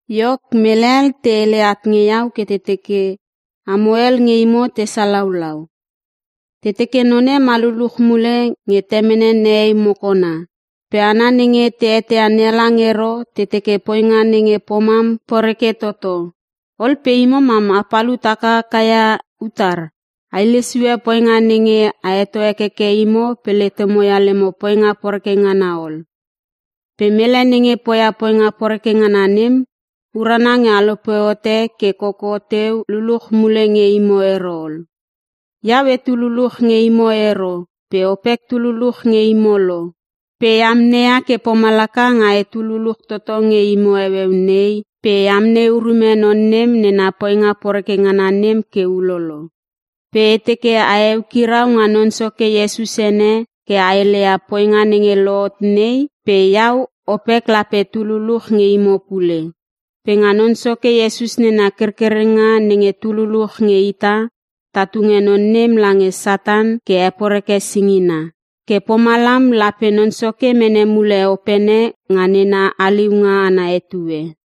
Iok, mele hel te hele at nge iau ke te teke amo hel nge imo te salaulau. Te teke none ma luluch mule nge temene nehei mokona. Pe hana nenge te eteia NeHalang ero te teke poinga nenge pomam poreke toto. Ol pe imo mam a palut hakaka ia utar? A hile sue poinga nenge a heto hekeke imo pe letemo ia lemo poinga poreke ngana ol. Pe mele nenge poia poinga poreke ngana nem, urana nge a lope hote ke koko teu luluch mule nge imo ero ol. Iau etu luluch nge imo ero pe opek tu luluch nge imo lo. Pe e amneia ke pomalaka nga etu luluch toto nge imo heueu nei pe e amnei urume non nem nena poinga poreke ngana nem ke ulolo. Pe e teke a heukirau nga Non Soke Iesus ene ke a heleia poinga nenge lohot nei pe iau opek lape tu luluch nge imo pule. Pe nga Non Soke Iesus nena kerkerenga nenge tu luluch nge ita, ta tunge non nem lange Satan ke heporeke singina. Ke pomalam lape Non Soke mene mule opene nga nena haliunga ana etue.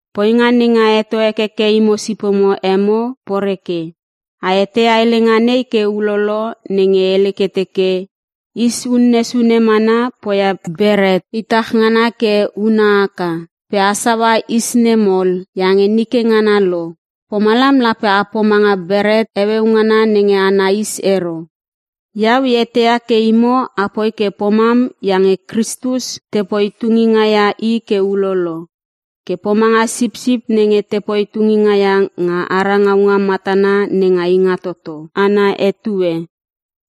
Poinga nenge a heto hekeke imo sipomo emo, poreke. A eteia helenga nei ke ulolo nenge hele ke teke, “Is unne sune mana poia beret itach ngana ke huna haka.” Pe a saua is nem ol iange nike ngana lo, pomalam lape a pomanga beret heueu ngana nenge ana is ero. Iau e eteia ke imo apoi ke pomam iange Kristus, tepoi tunginga ia I ke ulolo ke pomanga sipsip nenge tapoi tunginga ia nga ara ngaunga matana nenga Ingatoto ana etue.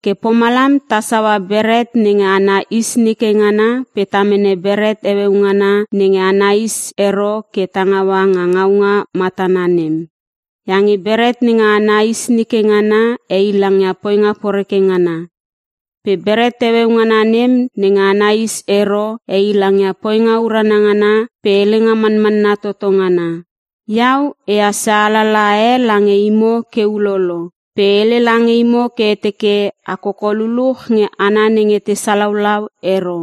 Ke pomalam ta saua beret nenge ana is nike ngana pe ta mene beret heueu ngana nenge ana is ero ke ta ngaua nga ngaunga matana nem. Iange beret nenge ana is nike ngana heilangia poinga poreke ngana. Pe beret heueu ngana nem nenge ana is ero heilangia poinga urana ngana pe helenga manmanna toto ngana. Iau e hassia alalaha e lange imo ke ulolo pe e hele lange imo ke e teke a koko luluch nge hana nenge te salaulau ero.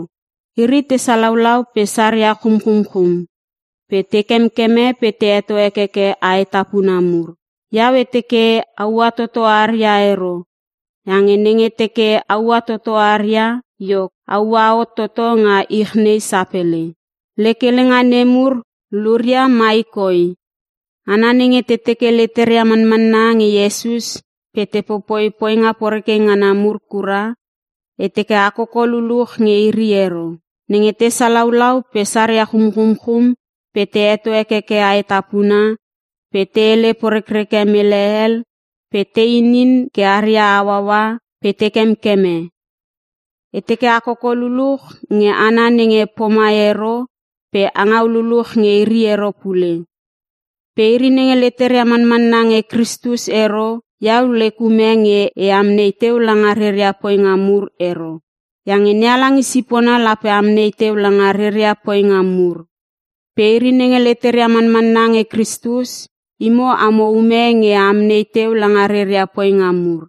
Iri te salaulau pe saria chumchumchum pe te kemkeme pe te heto hekeke aetapuna mur. Iau e teke a ua toto aria ero iange nenge teke a ua toto aria iok, a ua hot toto nga ich nei sapele. Lek helenga nemur luria mai koi: Hana nenge te teke leteria manmanna nge Iesus pe te popoia poinga poreke ngana mur kura, e teke a koko luluch nge iri ero. Nenge te salaulau, pe saria chumchumchum, pe te heto hekeke aetapuna, pe te hele porekreke mele hel, pe te inin ke aria hauaua, pe te kemkeme. E teke a koko luluch nge hana nenge pomai ero pe a ngau luluch nge iri ero pule. Pe iri nenge leteria manmanna nge Kristus ero, iau lek ume nge e amnei teu langa reria poinga mur ero. Iange NeHalang i sipona lape amnei teu langa reria poinga mur. Pe iri nenge leteria manmanna nge Kristus, imo amo ume nge a amnei teu langa reria poinga mur.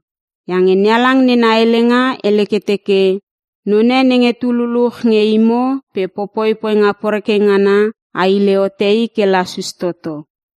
Iange NeHalang nena helenga hele ke teke, “None nenge tu luluch nge imo pe popoi poinga poreke ngana, a hile hote i ke lasus toto.”